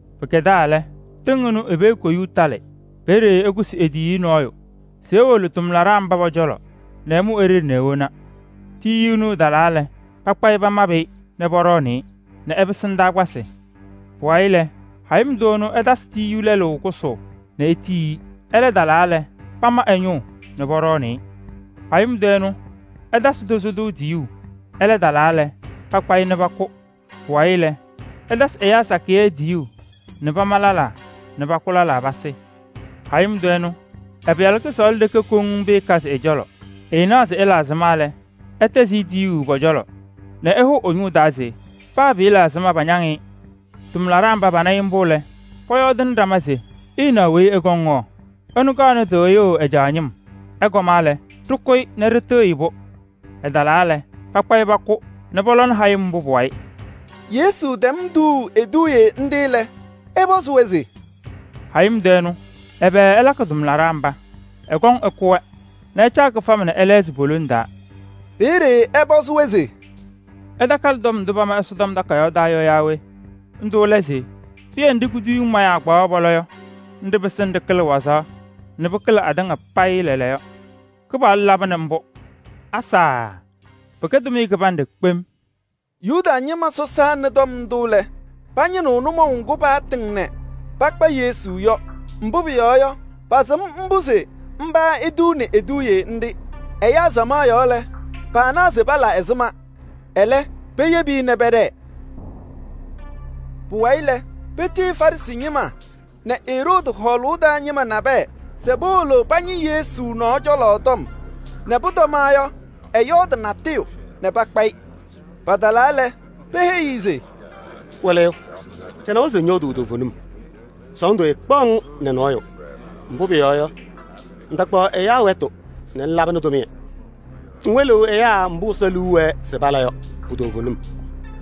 “Pɩkɛdaa lɛ, tɩŋ ɩnʋ i-pee koyuu talɩ. Peeye ɛkʋsɩ e-tiyiyu nɔɔyʋ se ewolo ɛ-tʋmlaɖaa mba pɔ-cɔlɔ nɛ ɛmʋ e-ɖeɖe nɛ ewona. Tiyiyu ɛnʋ ɛtalaa lɛ, pakpa-ɩ pamabɩ-ɩ nɛ pɔɖɔɔnɩ-ɩ nɛ ɛpɩsɩ ndaakpasɩ. Pʋwayɩ lɛ, hayɩm tʋ ɛnʋ ɛtasɩ tiyiyu lɛlʋ kʋsʋʋ nɛ etiyi-i. Ɛlɛ talaa lɛ, pama ɛ-ñʋʋ nɛ patʋʋ-ɩ. Hayɩm tʋ ɛnʋ, ɛtasɩ tozo tʋ tiyuu. Ɛlɛ talaa lɛ, pakpa-ɩ nɛ pakʋ. Pʋwayɩ lɛ, ɛtasɩ ɛyaa sakɩyɛ tiyuu nɛ pama lɛlaa nɛ pakʋ lɛlaa pasɩ. Hayɩm tʋ ɛnʋ, ɛ-pɩyalʋ kʋsɔɔlʋ ɖeke koŋ pɩɩkazɩ ɛ-cɔlɔ. Ɛɛnaɣ se ɛla ɛzɩma lɛ, ɛtɛzɩ-ɩ tiyuu pɔ-cɔlɔ nɛ ɛhʋʋ ɛ-taa se: ‘Paa pɩɩla ɛzɩma, pañaŋ-ɩ.’ Tʋmlaɖaa mba pana-ɩ mbʋ lɛ, pɔyɔɔdɩnɩ ɖama se: ‘Ɩnaɣ weyi ɛkɔŋ yɔ, ɛnʋ kaɣnɩ tɩɣyʋʋ ɛ-caa ñɩm. Ɛkɔma lɛ, ɖɩkʋ-ɩ nɛ ɖɩtɩɣyɩ-pʋ!’ Ɛtalaa lɛ, pakpa-ɩ pakʋ nɛ pɔlɔnɩ hayɩm mbʋ pʋ-wayɩ.” Yesu tɛm tuuu eduuye nɖɩ lɛ, ɛpɔzɩ-wɛ se: “Hayɩm tʋ ɛnʋ, ɛbɛ ɛlakɩ ɛ-tʋmlaɖaa mba? Ɛkɔŋ ɛkʋ-wɛ nɛ ɛcaa ɛyaa kɩfama nɛ ɛlɛɣzɩ po-lone taa.” Peeye ɛpɔzɩ-wɛ se: “Ɩtakalɩ tɔm ndʋ pama Ɛsɔtɔm Takayaɣ taa yɔ yaa we? Ndʋ lɛ se: ‘Pɩyɛ nɖɩ kuduyiŋ mayaa kpaɣaɣ pɔlɔ yɔ, nɖɩ pɩsɩnɩ ɖɩkɩlɩ wazaɣ atɩŋa payɩ lɛɛlɛɛyɔ. Mbʋ Kɩpaɣlʋ laba nɛ ɖɩnaɣ nɛ pɩɖɩɣzɩɣ-ɖʋ kpem!’” Yuda ñɩma sɔsaa nɩ tɔm ndʋ lɛ, pañɩnɩɣ nʋmɔʋ ŋgʋ paatɩŋ nɛ pakpa Yesu yɔ. Mbʋ pʋyɔɔ yɔ, pasɩm mbʋ se mba etuuni eduuye nɖɩ. Ɛyaa samaɣ yɔɔ lɛ, paanaɣ se pala ɛzɩma. Ɛlɛ, peyebi-i nɛ pɛɖɛɛ. Pʋwayɩ lɛ, petiyi Farɩsɩ ñɩma nɛ Eroodi hɔɔlʋʋ taa ñɩma nabɛyɛ se powolo pañɩ Yesu nɔɔ cɔlɔ tɔm nɛ pʋtɔma yɔ, ɛyɔɔdɩ natʋyʋ nɛ pakpa-ɩ. Patalaa lɛ, peheyi-i se: “Wɩlɩyʋ! Ɖɩnawa se ŋyɔɔdʋʋ toovenim, sɔɔndʋ ɛɛkpaɣ-ŋ nɛ nɔɔyʋ. Mbʋ pʋyɔɔ yɔ, ŋtakpaɣ ɛyaa wɛtʋ nɛ ŋlabɩnɩ tʋmɩyɛ. Ŋwɩlɩɣ ɛyaa mbʋ Ɛsɔ liu wɛɛ se pala yɔ pu-toovenim.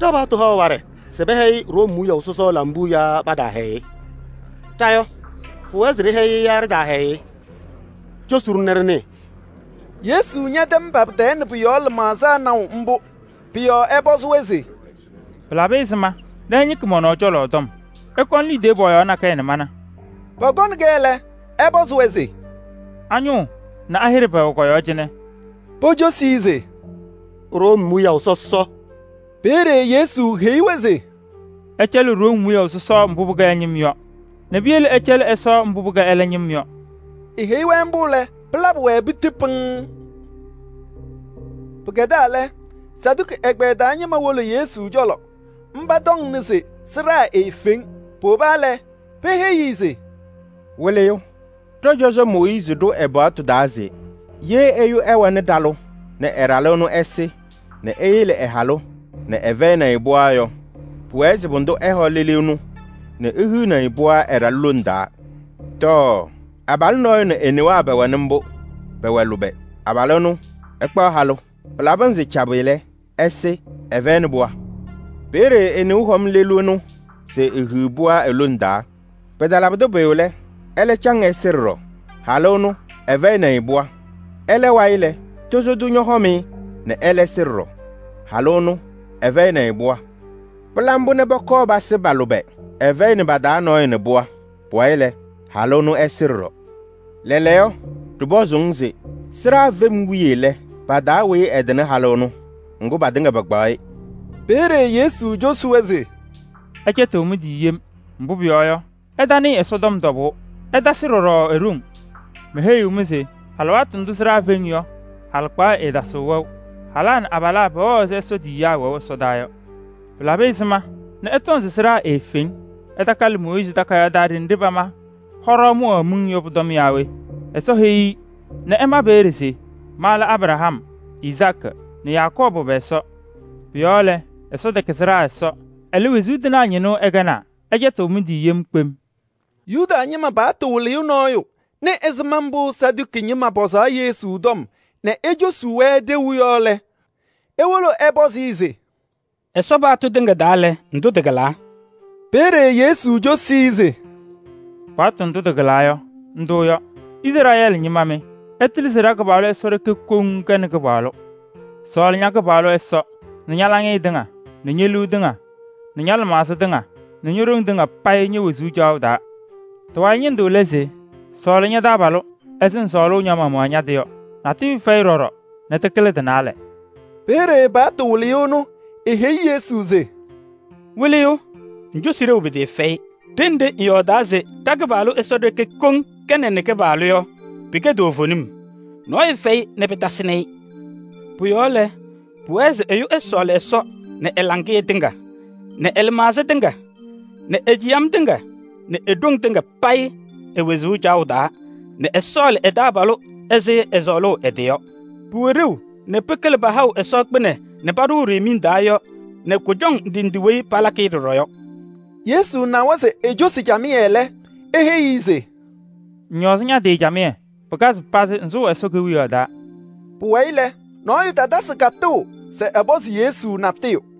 Ɖa-paɣtʋ haɣ waɖɛ se pɛhɛyɩ Room wiyaʋ sɔsɔ lambuu yaa pataahɛyɩ-ɩ? Ɖa yɔ, pʋwɛɛ se ɖɩhɛyɩ-ɩ yaa ɖɩtaahɛyɩ-ɩ? Cosi-ɖʋ nɛ ɖɩnɩɩ.” Yesu ñɛtɛm pa-pɩ-tɛɛ nɛ pʋ-yɔɔ lɩmaɣza naʋ mbʋ. Pʋ-yɔɔ ɛpɔzɩ-wɛ se: “Pɩlabɩ ɛzɩma nɛ ɩñɩkɩ mɔ-nɔɔ cɔlɔ tɔm? Ɩkɔnɩ liidiye pɔɔyaɣ nakɛyɛ nɛ mana.” Pɔkɔnɩ-kɛ lɛ, ɛpɔzɩ-wɛ se: “A-ñʋʋ nɛ a-hɩɖɛ pɛwɛ kɔ-yɔɔ cɩnɛ?” Pocosi-i se: “Room wiyaʋ sɔsɔ.” Peeye Yesu heyi-wɛ se: “Ɩcɛlɩ Room wiyaʋ sɔsɔ mbʋ pɩkɛ ɛ-ñɩm yɔ nɛ piyele ɩcɛlɩ Ɛsɔ mbʋ pɩkɛ ɛlɛ ñɩm yɔ.” Eheyi-wɛ mbʋ lɛ, pɩlabɩ-wɛ piti pɩŋŋ. Pɩkɛdaa lɛ, Saduki ɛgbɛyɛ taa ñɩma wolo Yesu cɔlɔ. Mba tɔŋnɩ se sɩɖaa eefeŋ. Powoba lɛ, peheyi-i se: “Wɩlɩyʋ, ɖɔ-cɔzɔ Mooyiizi ɖʋ ɛ-paɣtʋ taa se: ‘Ye ɛyʋ ɛwɛnɩ ɖalʋ nɛ ɛ-ɖalʋ ɛnʋ ɛsɩ nɛ eyele ɛ-halʋ nɛ ɛfɛyɩnɩ-ɩ pɩɣa yɔ, pʋwɛɛ se pʋdʋ ɛhɔ lelu ɛnʋ nɛ ehiɣni-i pɩɣa ɛ-ɖalʋ lone taa.’ Tɔɔ! Abalʋ nɔɔyʋ nɛ e-newaa pɛwɛnɩ mbʋ, pɛwɛ lʋbɛ, ɛkpaɣ halʋ. Pɩlabɩ pɩnzɩ cabɩ lɛ, abalʋ ɛnʋ ɛsɩ, ɛfɛyɩnɩ pɩɣa. Peeye e-neu hɔm lelu ɛnʋ se ehiɣ pɩɣa e-lone taa. Pɩtalabɩdɩ pʋyʋ lɛ, ɛlɛ caŋ ɛsɩ ɖɔɖɔ, halʋ ɛnʋ ɛfɛyɩnɩ-ɩ pɩɣa. Ɛlɛ wayɩ lɛ, tozo tʋ ñɔhɔm-ɩ nɛ ɛlɛ sɩ ɖɔɖɔ. Halʋ ɛnʋ ɛfɛyɩnɩ-ɩ pɩɣa. Pɩla mbʋ nɛ pɔkɔɔ pasɩ pa-lʋbɛ. Ɛfɛyɩnɩ pa-taa nɔɔyʋ nɛ pɩɣa. Pʋwayɩ lɛ, halʋ ɛnʋ ɛsɩ ɖɔɖɔ. Lɛɛlɛɛyɔ, ɖɩpɔzʋʋ-ŋ se: sɩɖaa fem wiye lɛ, pa-taa weyi ɛtɩnɩ halʋ ɛnʋ? Ŋgʋ patɩŋa pakpaɣ-ɩ!” Peeye Yesu cosi-wɛ se: “Ɩcɛtɩɣ mɩ-tɩ yem, mbʋ pʋyɔɔ yɔ, ɩtanɩɩ Ɛsɔtɔm tɔbʋʋ, ɩtasɩ ɖɔɖɔ e-ɖoŋ. Meheyiɣ-mɩ se alɩwaatʋ ndʋ sɩɖaa feŋ yɔ, halɩkpaɣyɛ ɛɛtasɩɣ wɛʋ. Halaa nɛ abalaa pɛwɛɣ ɛzɩ Ɛsɔ tiyiyaa wɛʋ ɛsɔdaa yɔ. Pɩlabɩ ɛzɩma nɛ ɩtɔŋ se sɩɖaa eefeŋ? Ɩtakalɩ Mooyiizi takayaɣ taa ɖenɖe pama hɔɖaɣ mʋwaɣ miŋ yɔ pʋ-tɔm naa we? Ɛsɔ heyi-i nɛ ɛma peeye se: ‘Ma lɛ Abraham nɛ Izaakɩ nɛ Yakɔɔbʋ pɛ-Ɛsɔ.’ Pʋ-yɔɔ lɛ, Ɛsɔ tɛkɛ sɩɖaa Ɛsɔ, ɛlɛ, wezuu tɩnaa ñɩnʋ ɛkɛnaa. Ɩcɛtɩɣ mɩ-tɩ yem kpem.” Yuda ñɩma paɣtʋ wɩlɩyʋ nɔɔyʋ nɩ ɛzɩma mbʋ Saduki ñɩma pɔzaɣ Yesu tɔm nɛ ecosuu-wɛ ɖeu yɔ lɛ, ewolo ɛpɔzɩ-ɩ se: “Ɛsɔ paɣtʋ tɩŋa taa lɛ, ndʋ tɩkɩlaa?” Peeye Yesu cosi-i se: “Mooyiizi ma ɛ-paɣtʋ takayaɣ taa se: ‘Izrɛɛlɩ ñɩma mɩ, ɩtɩlɩ se ɖa-Kɩpaɣlʋ Ɛsɔ ɖeke koŋ kɛnɩ Kɩpaɣlʋ. Sɔɔlɩ ña-Kɩpaɣlʋ Ɛsɔ nɛ ña-laŋɩyɛ tɩŋa nɛ ñe-liu tɩŋa nɛ ña-lɩmaɣza tɩŋa nɛ ño-ɖoŋ tɩŋa payɩ ñe-wezuu caɣʋ taa.’ Ndʋ kɩlɩnɩ lɛɛtʋ. Tɩ-wayɩ ñɩndʋ lɛ se: ‘Sɔɔlɩ ña-taabalʋ ɛzɩ ŋsɔɔlʋʋ ña-maɣmaɣ ña-tɩ yɔ.’ Natʋyʋ fɛyɩ ɖɔɖɔ nɛ tɩkɩlɩ tɩ-naalɛ.” Peeye paɣtʋ wɩlɩyʋ ɛnʋ eheyi Yesu se: “Wɩlɩyʋ! Ŋcosi ɖeu pɩtɩɩfɛyɩ. Ɖenɖe ŋyɔɔdaa se ɖa-Kɩpaɣlʋ Ɛsɔ ɖeke koŋ kɛnɩ Kɩpaɣlʋ yɔ, pɩkɛ toovenim. Nɔɔyʋ fɛyɩ nɛ pɩtasɩnɩ-ɩ. Pʋ-yɔɔ lɛ, pʋwɛɛ se ɛyʋ ɛsɔɔlɩ Ɛsɔ nɛ ɛ-laŋɩyɛ tɩŋa nɛ ɛ-lɩmaɣza tɩŋa nɛ e-ciyam tɩŋa nɛ e-ɖoŋ tɩŋa payɩ e-wezuu caɣʋ taa nɛ ɛsɔɔlɩ ɛ-taabalʋ ɛzɩ ɛsɔɔlʋʋ ɛ-tɩ yɔ. Pʋwɛ ɖeu nɛ pɩkɩlɩ pahaɣʋ Ɛsɔ kpɩnɛ nɛ paɖʋʋ miŋ taa yɔ nɛ kʋjɔŋ ndɩ ndɩ weyi palakɩ-ɩ ɖɔɖɔ yɔ.” Yesu nawa se ecosi-i camɩyɛ lɛ, eheyi-i se: “Ŋñɔɔzɩ ña-tɩ camɩyɛ, pɩkazɩ pazɩ, ŋsʋʋ Ɛsɔ Kewiyaɣ taa.” Pʋwayɩ lɛ, nɔɔyʋ tatasɩ katʋʋ se ɛpɔzɩ Yesu natʋyʋ.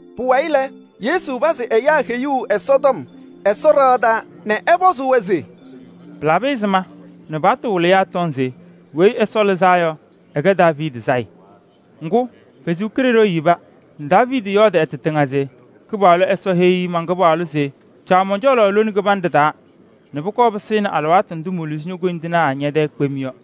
Pʋwayɩ lɛ, Yesu pazɩ ɛyaa heyuu Ɛsɔtɔm Ɛsɔ ɖɩɣa taa nɛ ɛpɔzɩ-wɛ se: “Pɩlabɩ ɛzɩma nɛ paɣtʋ wɩlɩyaa tɔŋ se Weyi Ɛsɔ Lɩzaa Yɔ ɛkɛ Daaviidi sayɩ? Ŋgʋ, Ɛsɔ Kalɩzaɣ yeba nɛ Daaviidi yɔɔdɩ ɛ-tɩ tɩŋa se: ‘Kɩpaɣlʋ Ɛsɔ heyi man-Kɩpaɣlʋ se: caɣ mɔn-cɔlɔ lone kɩbanɖɛ taa nɛ pʋkɔɔ pɩsɩnɩ alɩwaatʋ ndʋ moluzi ño-koyindinaa ñɛ-tɛɛ kpem yɔ.’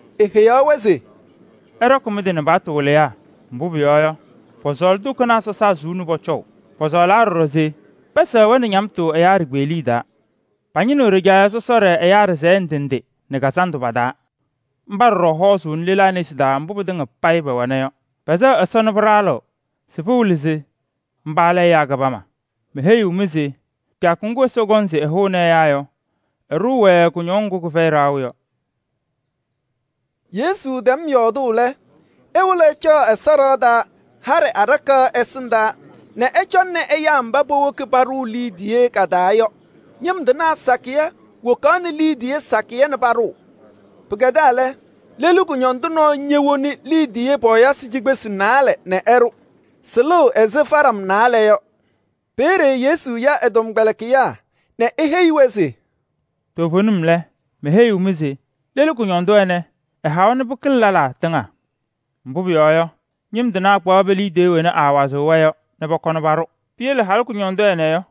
Eheyaɣ-wɛ se: “Ɩɖɔkɩ mɩ-tɩ nɛ paɣtʋ wɩlɩyaa. Mbʋ pʋyɔɔ yɔ, pɔsɔɔlɩ tokonaa sɔsaa suu nɛ pɔcɔʋ. Pɔsɔɔlaa ɖɔɖɔ se pɛsɛɣ-wɛ nɛ ñamtʋ ɛyaa ɖikpeɣliye taa. Pañɩnɩɣ ɖɩjaɣyɛ sɔsɔɖɛ Ɛsɔ ɖɩsɛyɛ ndɩ ndɩ nɛ kazandʋ pa-taa. Mba ɖɔɖɔ hɔɔzʋʋnɩ lelaa nesi taa mbʋ pɩtɩŋa payɩ pɛwɛna yɔ. Pɛsɛɣ Ɛsɔ nɛ pɩɖaɣlɩɣ se pɩwɩlɩ se mba lɛ ɛyaa kɩbama. Meheyiɣ-mɩ se kɩyakʋ ŋgʋ Ɛsɔ kɔŋ se ɛhʋnɩ ɛyaa yɔ, ɛɖʋʋ-wɛ kʋñɔŋ ŋgʋ kɩfɛyɩ ɖaɣʋ yɔ.” Yesu tɛm yɔɔdʋʋ lɛ, ewolo ɛcaɣ Ɛsɔ ɖɩɣa taa haɖɛ aɖakaɣ ɛsɩndaa nɛ ɛcɔŋnɩ ɛyaa mba powoki paɖʋʋ liidiye ka-taa yɔ. Ñɩm tɩnaa sakɩyɛ wokaɣnɩ liidiye sakɩyɛ nɛ paɖʋʋ. Pɩkɛdaa lɛ, lelu kʋñɔndʋ nɔɔyʋ ñowoni liidiye pɔɔyɩsɩ cikpesi naalɛ nɛ ɛɖʋ. Sɩlɩɣ ɛzɩ faɖam naalɛ yɔ. Peeye Yesu ya ɛ-tɔmkpɛlɩkɩyaa nɛ eheyi-wɛ se: “Toovenim lɛ, meheyiɣ-mɩ se lelu kʋñɔndʋ ɛnɛ, ɛhawa nɛ pɩkɩlɩ lɛlaa tɩŋa. Mbʋ pʋyɔɔ yɔ, ñɩm tɩnaa kpaɣ pe-liidiye wena aawazɩɣ-wɛ yɔ nɛ pɔkɔnɩ paɖʋ. Piyele halʋ kʋñɔndʋ ɛnɛ yɔ,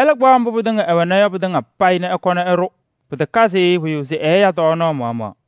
ɛlɛ kpaɣ mbʋ ɛwɛna yɔ pɩtɩŋa payɩ nɛ ɛkɔnɩ ɛɖʋ. Pɩtakazɩ-ɩ pʋyʋ se ɛɛya tɔɔnaɣ maɣmaɣ.”